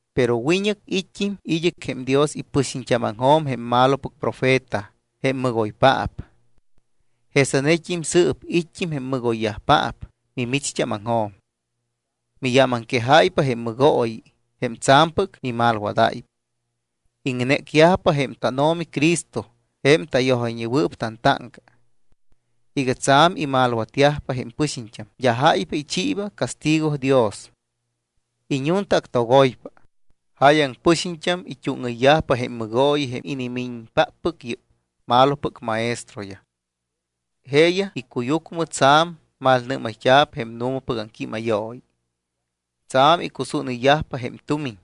Pero wiñɨc it́t́im id́ɨc jém Dios ipɨxiñt́ámaŋjo̱m jém malopɨc profeta jém mɨgoypaap. Jesanet́im sɨɨp it́t́im jém mɨgoyyajpaap mimicht́ámaŋjo̱m. Miyámaŋquejáypa jém mɨgooyi, jém tsa̱mpɨc mimalwadáypa. Iŋnécyajpa jém tánO̱mi Cristo jém tayojayñewɨɨp tantáŋca. Iga tsa̱m imalwatyajpa jém pɨxiñt́am, d́a jáypa ichiiba castigo Dios. Iñuntaactogoypa. Jáyaŋ pɨxiñt́am it́úŋɨyyajpa jém mɨgooyi jém inimiñpáppɨc yɨ́p malopɨc maestroyaj. Jeeyaj icuyucmɨ tsa̱m malnɨ́mayt́a̱p jém nu̱mapɨc aŋquímayooyi. Tsa̱m icusúnɨyyajpa jém tumiñ.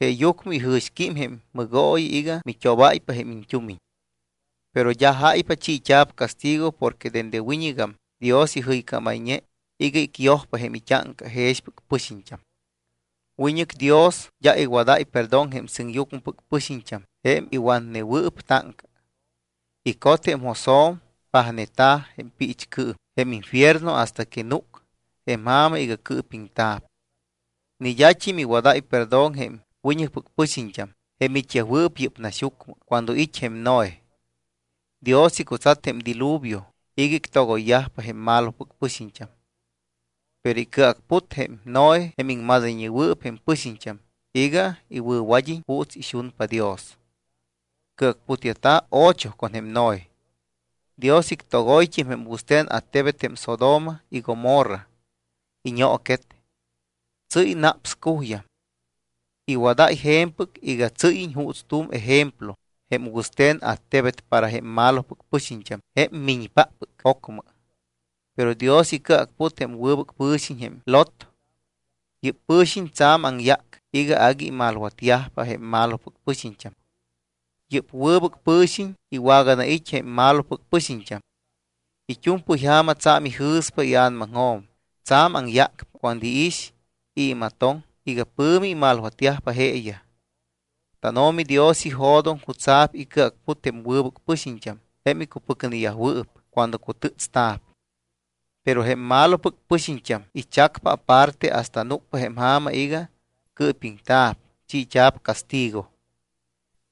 Jeeyucmɨ ijɨ̱xquím jém mɨgooyi iga mit́obáypa jém iñt́umiñ. Pero d́a jáypa chiit́a̱p castigo porque dende wiñɨgam Dios ijɨycámayñe iga icyojpa jém it́áŋca jexpɨc pɨxiñt́am. Wiñɨc Dios d́a iwadáy perdón jém sɨŋyucmɨpɨc pɨxiñt́am jém iwatnewɨɨp táŋca. Icot jém josjo̱m, pajneta̱ jém piichcɨɨm, jém infierno, hasta que núc jém ja̱ma iga cɨɨpiŋta̱p. Ni d́at́im iwadáy perdón jém wiñɨcpɨc pɨxiñt́am, jém it́yajwɨɨp yɨ́p naxyucmɨ cuando it́ jém Noé. Dios icutsat jém diluvio iga ictogoypa jém malopɨc pɨxiñt́am. Pero icɨacput jém Noé jém iŋmadayñewɨɨp jém pɨxiñt́am iga iwɨ̱wad́iñ juuts ixunpa Dios. Cɨacputyajta̱ ocho con jém Noé. Dios ictogoyt́im jém wɨste̱n attebet jém Sodoma y Gomorra. Iñooquet. Tsɨ́y naps cuyjam. Iwadáy je̱mpɨc iga tsɨ́yiñ juuts tu̱m ejemplo jém wɨste̱n attebet para jém malopɨc pɨxiñt́am jém miñpáppɨc ocmɨ. Pero Dios icɨacput jém wɨbɨc pɨ̱xiñ jém Lot. Yɨ́p pɨ̱xiñ tsa̱m aŋyác iga agui imalwatyajpa jém malopɨc pɨxiñt́am. Yɨ́p wɨbɨc pɨ̱xiñ iwaganait́ jém malopɨc pɨxiñt́am. It́u̱mpɨy ja̱ma tsa̱m ijɨ̱spa ia̱namaŋjo̱m, tsa̱m aŋyácpa cuando iix y imatoŋ iga pɨ̱mi imalwatyajpa jeeyaj. TánO̱mi Dios ijo̱doŋ jutsa̱p icɨacput jém wɨbɨc pɨxiñt́am, jém icupɨcneyajwɨɨp, cuando cutɨ́tsta̱p. Pero jém malopɨc pɨxiñt́am ichacpa aparte hasta núcpa jém ja̱ma iga cɨɨpiŋta̱p, chiit́a̱p castigo.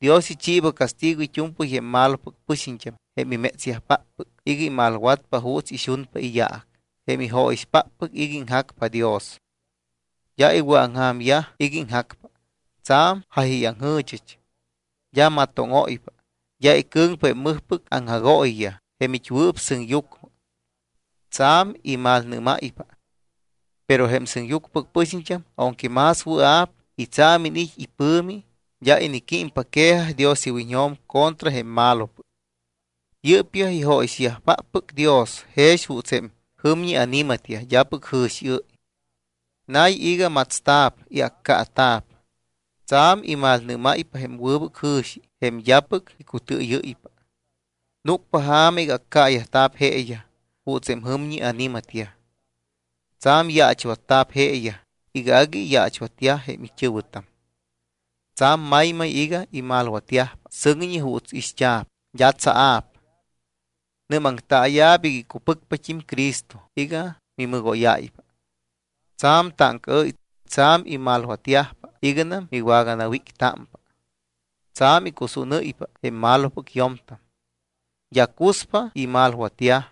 Dios ichiiba castigo it́u̱mpɨy jém malopɨc pɨxiñt́am, jém imétsyajpáppɨc iga imalwatpa juuts ixunpa iyaac, jém ijóyixpáppɨc iga iŋjacpa Dios. D́a iwɨ̱aŋja̱myaj iga iŋjacpa. Tsa̱m jáyayaŋjɨ̱chɨch. D́a matóŋóypa. D́a icɨ̱ŋpa jém mɨjpɨc aŋjagooyiyaj jém it́wɨɨp sɨŋyucmɨ, tsa̱m imalnɨ́máypa. Pero jém sɨŋyucmɨpɨc pɨxiñt́am aunque más wɨa̱p y tsa̱m iniit́ ipɨ̱mi, d́a iniquímpa quejaj Dios iwiñjo̱m contra jém malopɨc. Yɨ́pyaj ijóyixpáppɨc Dios jex juuts jém jɨmñi ani̱matyaj d́apɨc jɨ̱xiɨ́y. Nay iga matsta̱p y accaata̱p. Tsa̱m imalnɨ́máypa jém wɨbɨc jɨ̱xi jém d́apɨc icutɨɨyɨ́ypa. Núcpa ja̱ma iga accaayajta̱p jeeyaj juuts jém jɨmñi ani̱matyaj. Tsa̱m yaachwatta̱p jeeyaj iga agui iyaachwatyaj jém it́ɨ̱wɨtam. Tsa̱m maymay iga imalwatyajpa sɨŋñi ju̱t́ ixt́a̱p, d́a tsaa̱p. Nɨ́maŋtaaya̱p iga icupɨcpat́im Cristo iga mimɨgóyáypa. Tsa̱m táŋcaɨ́y, tsa̱m imalwatyajpa iganam miwagawíctámpa. Tsa̱m icusúnɨ́ypa jém malopɨc yo̱mtam. D́a cuspa imalwatyaj.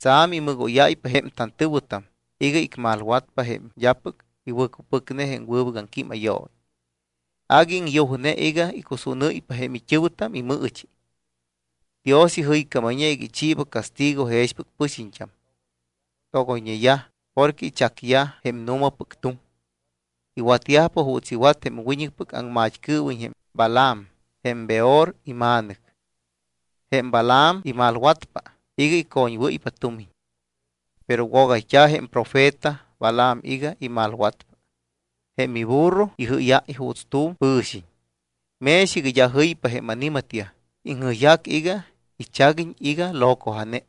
Tsa̱m imɨgóyáypa jém tantɨ̱wɨtam iga icmalwatpa jém d́apɨc iwɨ̱cupɨcne jém wɨbɨc aŋquímayooyi. Agui iŋyujne iga icusúnɨ́ypa jém it́ɨ̱wɨtam imɨɨchi. Dios ijɨycámayñe iga ichiiba castigo jexpɨc pɨxiñt́am. Togoyñeyaj porque ichacyaj jém nu̱mapɨc tuŋ. Iwatyajpa juuts iwat jém wiñɨcpɨc aŋmat́cɨɨwiñ jém Balaam jém Beor ima̱nɨc. Jém Balaam imalwatpa iga icoñwɨ́ypa tumiñ. Pero wogayt́a̱ jém profeta Balaam iga imalwatpa. Jém iburro ijɨ́yáy juuts tu̱m pɨ̱xiñ. Mex iga d́a jɨypa jém ani̱matyaj, iŋjɨyjac iga ichaguiñ iga locoja̱ne.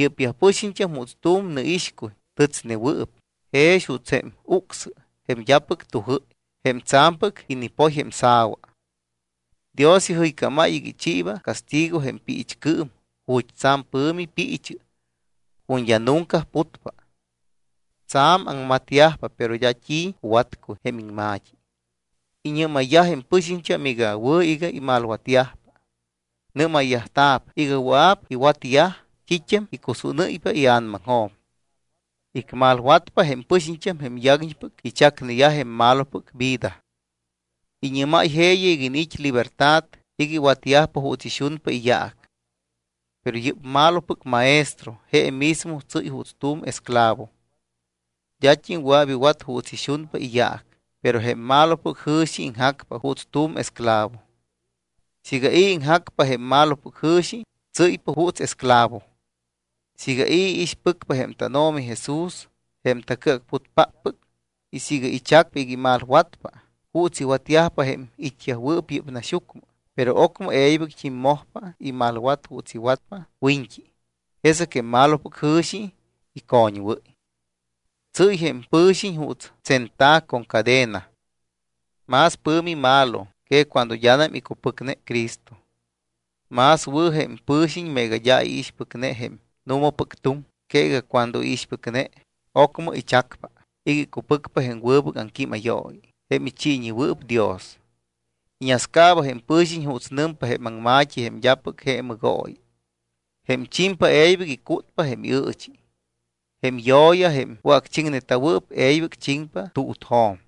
Yɨ́pyaj pɨxiñt́am juuts tu̱m nɨixcuy tɨtsnewɨɨp, jex juuts jém ucsɨ jém d́apɨc tujɨ́y, jém tsa̱mpɨc inipoy jém sa̱wa. Dios ijɨycámáy iga ichiiba castigo jém piichcɨɨm, ju̱t́ tsa̱m pɨ̱mi piichɨ, ju̱t́ d́a nunca putpa. Tsa̱m aŋmatyajpa, pero d́a t́i cuwatcuy jém iŋma̱t́i. Iñɨ́mayyaj jém pɨxiñt́am iga wɨ̱ iga imalwatyajpa. Nɨ́mayt́a̱p iga wɨa̱p iwatyaj t́it́am icusúnɨ́ypa ia̱namaŋjo̱m. Icmalwatpa jém pɨxiñt́am jém yaguiñpɨc ichacneyaj jém malopɨc vida. Iñɨ́máy jeeyaj iga iniit́ libertad iga iwatyajpa juuts ixunpa iyaac. Pero yɨ́p malopɨc maestro je mismo tsɨ́y juuts tu̱m esclavo. D́at́im wɨa̱p iwat juuts ixunpa iyaac, pero jém malopɨc jɨ̱xi iŋjacpa juuts tu̱m esclavo. Siiga i̱ iŋjacpa jém malopɨc jɨ̱xi, tsɨ́ypa juuts esclavo. Siiga i̱ iixpɨcpa jém tánO̱mi Jesús, jém tacɨacputpáppɨc, y siiga ichac iga imalwatpa juuts iwatyajpa jém it́yajwɨɨp yɨ́p naxyucmɨ, pero ocmɨ e̱ybɨct́im mojpa imalwat juuts iwatpa wiñt́i, jesɨc jém malopɨc jɨ̱xi icoñwɨ́y. Tsɨ́y jém pɨ̱xiñ juuts tsenta̱ con cadena. Más pɨ̱mi malo que cuando d́anam icupɨcne Cristo. Más wɨ̱ jém pɨ̱xiñ meega d́a iixpɨcne jém nu̱mapɨc tuŋ que iga cuando iixpɨcne, ocmɨ ichacpa iga icupɨcpa jém wɨbɨc aŋquímayooyi jém ichiiñewɨɨp Dios. Iñascaaba jém pɨ̱xiñ juuts nɨmpa jém aŋma̱t́i jém d́apɨc je mɨgooyi: “Jém chimpa e̱ybɨc icútpa jém iɨɨchi. Jém yo̱ya, jém wɨ̱acchiŋneta̱wɨɨp, e̱ybɨc chiŋpa tuutjo̱m.”